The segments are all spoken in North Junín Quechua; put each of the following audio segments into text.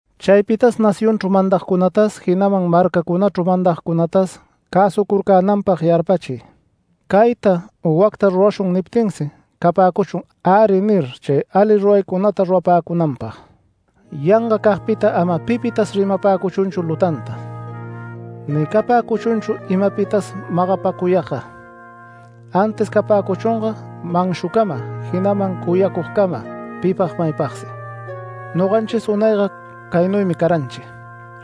Chaypitas nacionchru mandagtas jinaman marcacunachru mandagcunatas cäsucurcänanpag yarpachiy. “Cayta u wacta rurashun” niptinsi capäcuchun “Äri” nir chay ali ruraycunata rurapäcunanpag. Yangacagpita ama pipitas rimapäcuchunchu lutanta, ni capäcuchunchu imapitas magapacuyagga. Antis capäcuchunga manshucama jinaman cuyacugcama pipag maypagsi. Noganchis unayga caynuymi caranchi;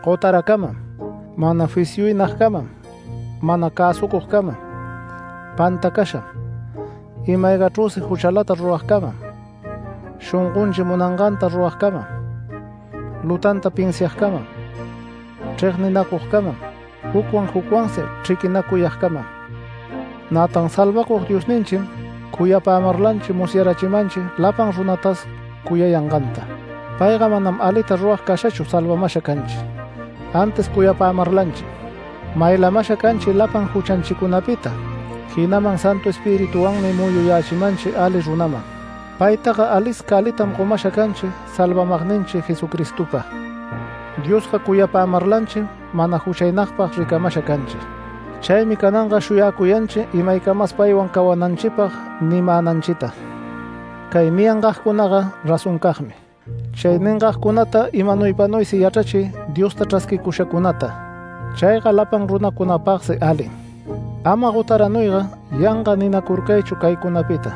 gotaracamam, mana fisyuynagcamam, mana cäsucugcamam, pantacasham, ima-aygachrüsi juchalata ruragcamam, shongonchi munanganta ruragcamam, lutanta pinsiagcamam, chregninacugcamam, jucwan jucwansi chriquinacuyagcamam. Nätan Salvacug Diosninchim cuyapämarlanchi musyarachimanchi lapan runatas cuyayanganta. Payga manam alita rurag cashachu Salvamasha canchi. Antis cuyapämarlanchim, maylamasha canchi lapan juchanchicunapita, jinaman Santu Espirituwanmi muyuyächimanchi ali runaman. Paytaga alisca alitam gomasha canchi Salvamagninchi Jesucristopa. Diosga cuyapämarlanchim mana juchaynagpag ricamasha canchi. Chaymi cananga shuyacuyanchi imaycamas paywan cawananchipag nimänanchita. Cay niyangagcunaga razoncagmi. Chay ningagcunata imanuypanuysi yachrachiy Diosta chrasquicushacunata. Chayga lapan runacunapagsi alim. Ama gotaranuyga, yanga ninacurcaychu caycunapita;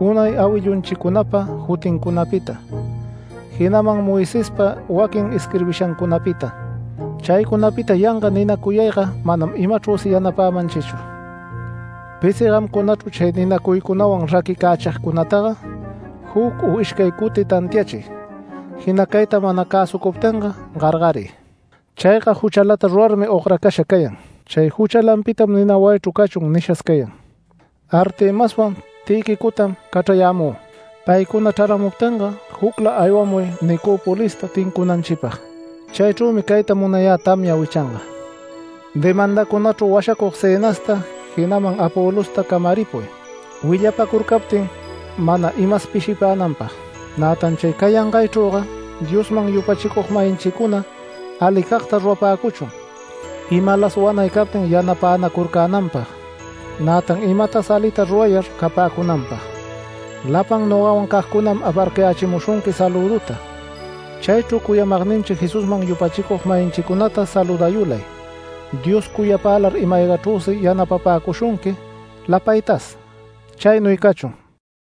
unay awillunchicunapa jutincunapita, jinaman Moisespa waquin isquirbishancunapita. Chaycunapita yanga ninacuyayga manam imachrüsi yanapämanchichu. Pisi gamcunachru chay ninacuycunawan raquicächigcunataga juc u ishcay cuti tantiachiy jinacayta mana cäsucuptinga gargariy. Chayga juchalata rurarmi ogracasha cayan. Chay juchalanpitam nina wayichru cachun nishas cayan. Artemaswan Tïquicotam cachrayämü. Paycuna chraramuptinga jucla aywamuy Nicopolista tincunanchipag. Chaychrümi cayta munayä tamya wichanga. Demandacunachru washacug Zenasta, jinaman Apolosta camaripuy, willapacurcaptin mana imas pishipänanpag. Nätan chay cayangaychrüga Diosman yupachicug-mayinchicuna alicagta rurapäcuchun, imalas wanay captin yanapänacurcänanpag, nätan imatas alita rurayar capäcunanpag. Lapan nogawan cagcunam aparcayächimushunqui salüduta. Chaychru cuyamagninchi Jesusman yupachicug-mayinchicunata saludayulay. Dios cuyapälar ima-aygachrüsi yanapapäcushunqui lapaytas. Chaynuy cachun.